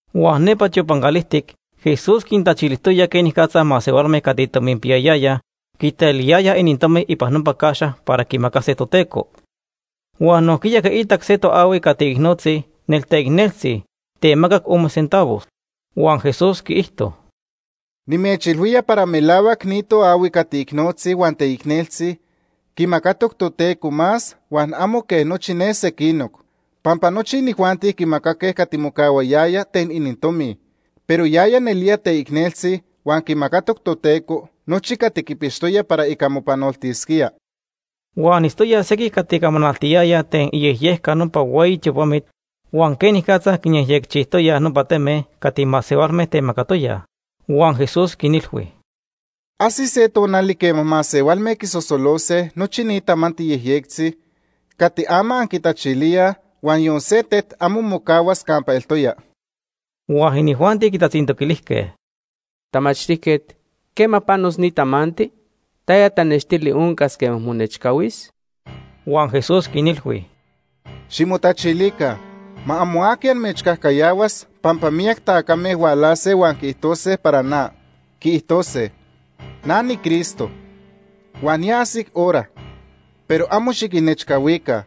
Huan nepa tiopan calijtic Jesús quintachilijtoya quenicatza masehualme cati tominpiyayayaj quitaliyayaj inintomi ipan nopa caxa para quimacase Toteco. Huan nojquiya quiitac se toahui cati icnotzi nelteicneltzi temacac ome centavos. Huan Jesús quiijto: ―Nimechilhuía para melahuac ni toahui cati icnotzi huan teicneltzi quimacatoc Toteco más huan amo quej nochi ne sequinoc. Pampa nochi inijuanti quimacaque cati mocahuayaya ten inintomi, pero yaya nelía teicneltzi, huan quimacatoc Toteco nochi cati quipixtoya para ica mopanoltisquía. Huan itztoyaj sequij cati camanaltiyayaj ten iyejyejca nopa hueyi tiopamit huan quenicatza quinyejyecchijtoyaj nopa teme cati masehualme temacatoyaj. Huan Jesús quinilhui: ―Ajsis se tonali quema masehualme quisosolose nochi ni tamanti yejyectzi cati ama anquitachilíaj, huan yon se tet amo mocahuas campa eltoya. Huan inijuanti quitatzintoquilijque: ―Tamachtijquet, ¿quema panos ni tamanti? ¿Taya tanextili oncas quema monechcahuis? Huan Jesús quinilhui: “Ximotachilica. Ma amo aqui amechcajcayahuas pampa miyac tacame hualase huan quiijtose para na. Quiijtose: ‘Na niCristo’, huan ‘Ya ajsic hora’, pero amo xiquinnechcahuica.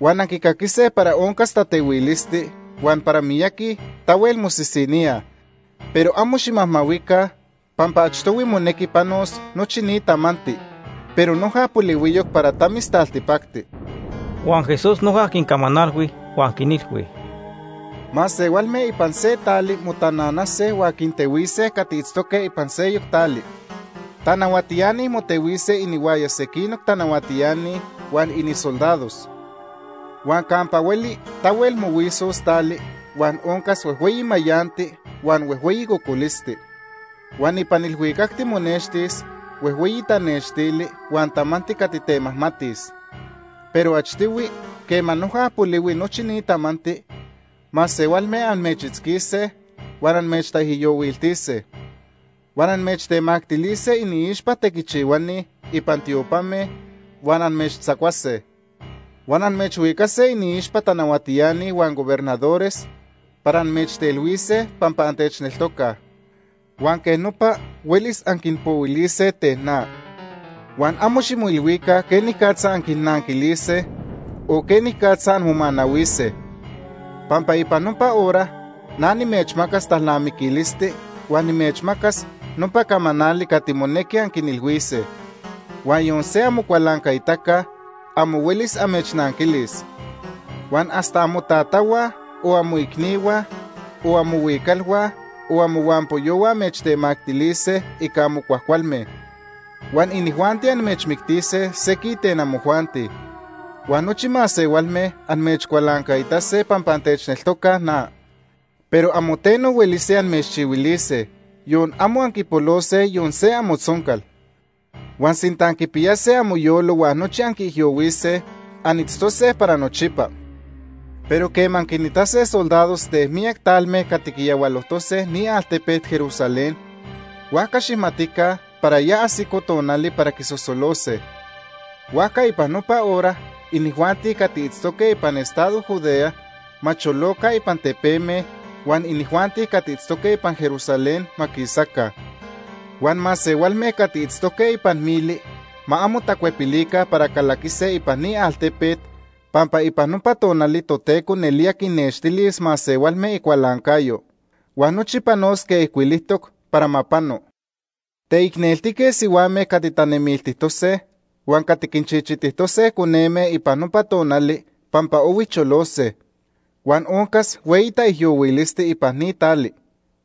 Huan anquicaquise para oncas tatehuilisti huan para miyaqui tahuel mosisiníaj, pero amo ximajmahuica pampa achtohui monequi panos nochi ni tamanti, pero noja polihuiyoc para tamis taltipacti.” Huan Jesús noja quincamanalhui huan quinilhui: “Masehualme ipan se tali motananase huan quintehuise cati itztoque ipan seyoc tali. Tanahuatiani motehuise inihuaya sequinoc tanahuatiani huan inisoldados. Huan campa hueli tahuel mohuisos tali, huan oncas huejhueyi mayanti, huan huejhueyi cocolisti. Huan ipan ilhuicac monextis huejhueyi tanextili huan tamanti cati temajmatis. “Pero achtohui, quema noja polihui nochi ni tamanti, masehualme amechitzquise huan amechtaijyohuiltise. Huan amechtemactilise iniixpa tequichihuani ipan tiopame, huan amechtzacuase. Huan amechhuicase iniixpa tanahuatiani huan gobernadores para amechtelhuise pampa antechneltocaj. Huan quej nopa huelis anquinpohuilise ten na. Huan amo ximoilhuica quenicatza anquinnanquilise o quenicatza anmomanahuise, pampa ipan nopa hora na nimechmacas talnamiquilisti huan nimechmacas nopa camanali cati monequi anquinilhuise, huan yon se amocualancaitaca amo huelis amechnanquilis. Huan hasta amotatahua, o amoicnihua, o amohuicalhua, o amohuampoyohua amechtemactilise ica amo cuajcualme. Huan inijuanti amechmictise sequij ten amojuanti. Huan nochi masehualme amechcualancaitase pampa antechneltocaj na. Pero amo teno huelise amechchihuilise, yon amo anquipolose yon se amotzoncal. Huan sinta anquipiyase amoyolo huan nochi anquiijyohuise, anitztose para nochipa. “Pero quema anquinitase soldados ten miyac talme cati quiyahualojtose ni altepet Jerusalén, huajca xijmatica para ya ajsico tonali para quisosolose. Huajca ipan nopa hora, inijuanti cati itztoque ipan estado Judea ma choloca ipan tepeme, huan inijuanti cati itztoque ipan Jerusalén ma quisaca. Huan masehualme cati itztoque ipan mili ma amo tacuepilica para calaquise ipan ni altepet, pampa ipan nopa tonali Toteco nelía quinnextilis masehualme icualancayo. Huan nochi panos quej ijcuilijtoc para ma pano. Teicneltique sihuame cati tanemiltijtose huan cati quinchichitijtose coneme ipan nopa tonali pampa ohui cholose. Huan oncas hueyi taijyohuilisti ipan ni tali,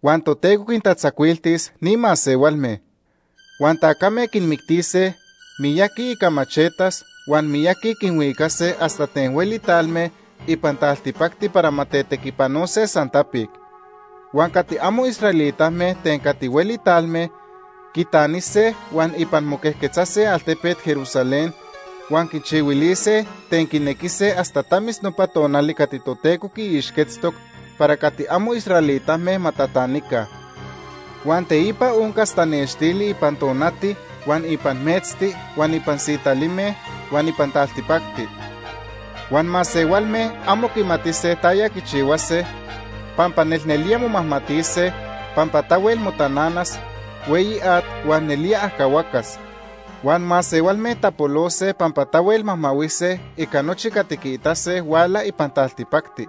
huan Toteco quintatzacuiltis ni masehualme. Huan tacame quinmictise miyaqui ica machetas huan miyaqui quinhuicase hasta ten hueli talme ipan taltipacti para ma tetequipanose san tapic. Huan cati amo israelitame ten cati hueli talme quitanise huan ipan moquejquetzase altepet Jerusalén huan quichihuilise ten quinequise hasta tamis nopa tonali cati Toteco quiixquetztoc para cati amo israelitame ma tatanica. “Huan teipa oncas tanextili ipan tonati huan ipan metzti huan ipan sitalime huan ipan taltipacti. Huan masehualme amo quimatise taya quichihuase pampa nelnelía momajmatise, pampa tahuel motananas hueyi at huan nelía ajcahuacas. Huan masehualme tapolose pampa tahuel majmahuise ica nochi cati quiitase huala ipan taltipacti,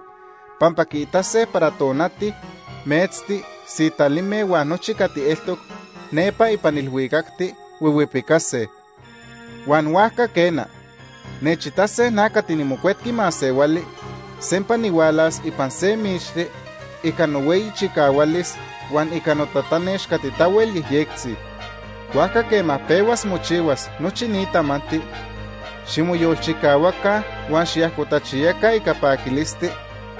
pampa quiitase para tonati, metzti, sitalime huan nochi cati eltoc nepa ipan ilhuicacti huihuipicase. Huan huajca quena, nechitase na cati niMocuetqui Masehuali sempa nihualas ipan se mixti ica nohueyi chicahualis, huan ica notatanex cati tahuel yejyectzi. Huajca quema pehuas mochihuas nochi ni tamanti, ximoyolchicahuaca huan xiajcotachiyaca ica paquilisti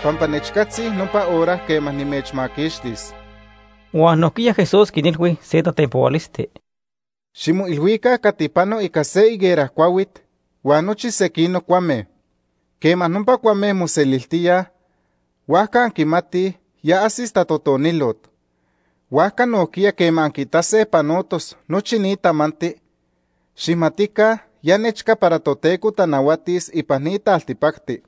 pampa nechcatzi nopa hora quema nimechmaquixtis.” Huan nojquiya Jesús quinilhui se tatenpohualisti: “Ximoilhuica cati pano ica se higuera cuahuit huan nochi sequinoc cuame. Quema nopa cuame moseliltíaj, huajca anquimatij ya ajsis tatotonilot. Huajca nojquiya quema anquiitase panotos nochi ni tamanti, xijmatica ya nechca para Toteco tanahuatis ipan ni taltipacti.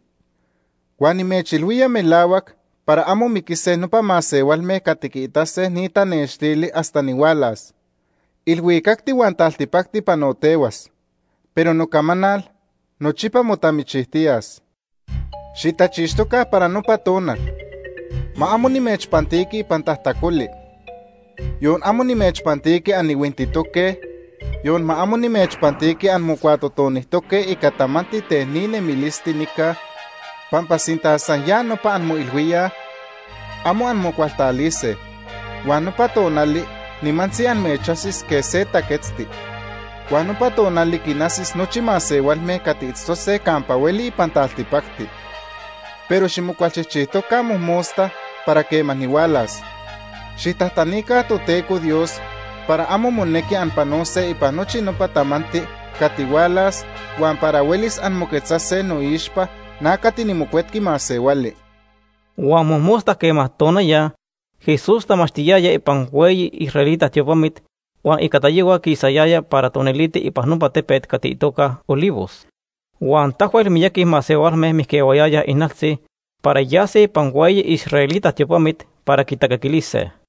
“Huan nimechilhuía melahuac para amo miquise nopa masehualme cati quiitase ni tanextili hasta nihualas. Ilhuicacti huan taltipacti panotehuas, pero nocamanal nochipa motamichijtiyas. “Xitachixtoca para nopa tonal. Ma amo nimechpantiqui ipan tajtacoli. Yon amo nimechpantiqui anihuintitoque, yon ma amo nimechpantiqui anmocuatotonijtoque ica tamanti ten ni nemilisti nica, pampa sinta san ya nopa anmoilhuíaj, amo anmocualtalise, huan nopa tonali nimantzi amechajsis quej se taquetzti. Huan nopa tonali quinajsis nochi masehualme cati itztose campa hueli ipan taltipacti. Pero ximocualchijchijtoca mojmosta para quema nihualas. Xijtajtanica Toteco Dios para amo monequi anpanose ipan nochi nopa tamanti cati hualas huan para huelis anmoquetzase noixpa na cati niMocuetqui Masehuali.” Huan mojmosta quema tonaya, Jesús tamachtiyaya ipan hueyi israelita tiopamit huan ica tayohua quisayaya para toniliti ipan nopa tepet cati itoca Olivos. Huan tahuel miyaqui masehualme mijquehuayayaj ijnaltzi para yase ipan hueyi israelita tiopamit para quitacaquilise.